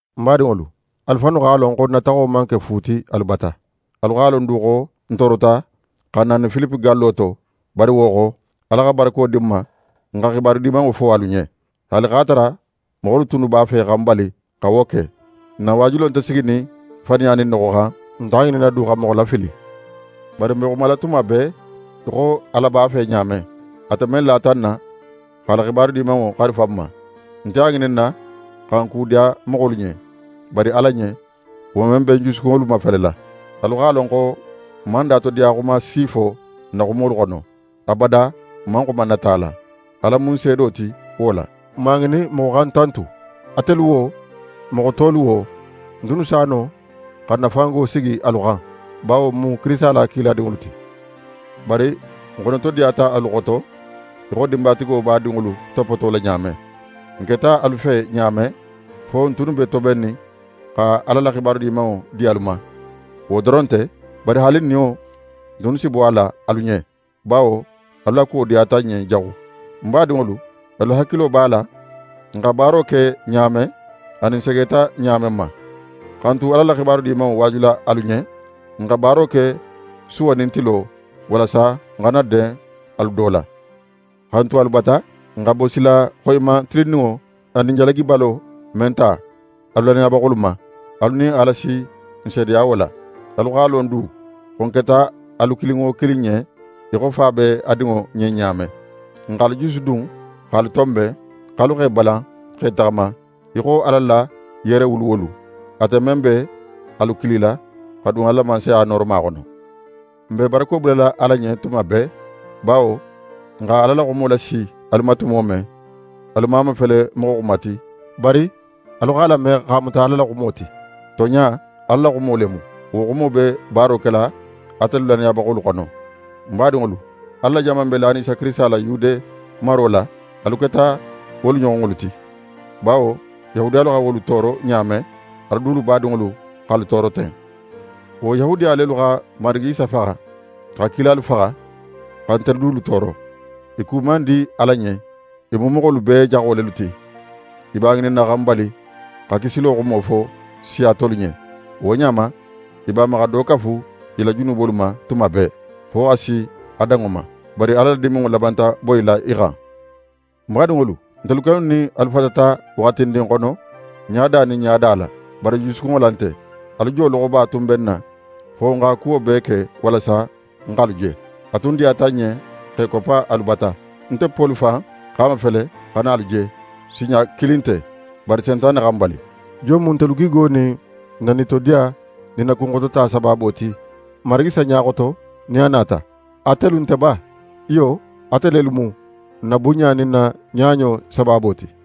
N badinŋolu, alu fannu x'a lon xo n na taxo man ke fu ti alu bata. Alu x'a lon du xo n toorota xa n nani Filipe gallo to; bari wo xo, Ala xa barako di n ma n x'a la xibaru Dimanŋo fo alu ɲen, haali x'a tara moxolu tunnu b'a fe xa n bali xa wo ke. N na waajulo nte siginin faniya nin noxo xan, n nte a ŋininna du xa moxo lafili. Bari n be xumala tuma bee í xo Ala b'a fe ɲa men; ate men lata n na x'a la Xibaru Dimanŋo xarifa n ma. N nte a ŋininna xa n kudiya moxolu ɲen; bari Ala ɲen, wo men be n jusukunŋolu mafelela. Alu x'a lon xo n man datodiyaxuma si fo n na xumolu xono, abada n man xuma nata la. Ala mu n seedo ti wo la. N man a ŋinin moxo xa n tantu, atelu wo, moxo tolu wo. N tunnu s'a no xa n na fango sigi alu xan, bawo n mu Kirisita la kiladinŋolu ti. Bari n xonotodiyata alu xoto í xo dinbatigo b'a dinŋolu topotola ɲa men. N keta alu fe ɲa men, fo n tunnu be tobennin xa Ala la Xibaru Dimanŋo di alu ma. Wo doron nte, bari haali n niyo, n tunnu si bo a la alu ɲen, bawo alu la kuwo diyata n ɲen jaxu. N badinŋolu, alu hakilo b'a la n xa baaro ke ɲa men anin n segeta ɲa men ma. Xa n tu Ala la Xibaru Dimanŋo waajula alu ɲen, n xa baaro ke suwo nin tilo, walasa n xana den alu do la. Xa n tu alu bata, n xa bosila xoyiman tilinninŋo anin jalagibalo men ta alu lannayabaxolu ma, alu nin Ala si n seedeya wo la. Alu x'a lon du, xo n keta alu kilin wo kilin ɲen í xo fa be a dinŋo ɲen ɲa men. N x'alu jusudun x'alu tonben, x'alu x'e balan x'e taxama í xo Ala la yerewuluwolu; ate men be alu kilila, xa dun a la Mansaya nooroma xono. N be barako bulala Ala ɲen tuma bee, bawo, n xa Ala la xumo lasi alu ma tumo men, alu man a mafele moxo xuma ti; bari alu x'a lame x'a muta Ala la xumo ti. Tonɲa, Ala la xumo le mu. Wo xumo be baaro kela atelu lannayabaxolu xono. N badinŋolu, Ala la jama men be lanin Isa Kirisita la Yude maro la, alu keta wolu ɲoxonŋolu ti. Bawo Yahudiyalu xa wolu tooro ɲa men, alu dulu badinŋolu x'alu tooro ten. Wo Yahudiya lelu xa Marigi Isa faxa, xa kilalu faxa, xa ntelu dulu tooro. I ku man di Ala ɲen. I mu moxolu bee jaxo lelu ti. I b'a ŋininna xa n bali xa kisilo xumo fo siya tolu ɲen. Wo ɲa ma, i b'a ma xa do kafu i la junubolu ma tuma bee, fo xa si a danŋo ma. Bari Ala la diminŋo labanta boyila i xan. N badinŋolu, ntelu kennu nin alu fatata waxatindin xono, ɲada nin ɲada la, bari jusukunŋo la nte. Alu jo loxoba tun be n na, fo n xa kuwo bee ke walasa n x'alu je. A tun diyata n ɲen x'e koppa alu bata. Nte Poli fan x'a mafele xa na alu je, sinɲa kilin nte, bari Sentane xa n bali. Jon mu ntelu gigo nin n na nitodiya nin n na kunxotota sabaabo ti Marigi Isa ɲa xoto nin a nata? Atelu nte ba? Iyo, ate lelu mu n na bunɲa nin n na ɲaɲo sabaabo ti.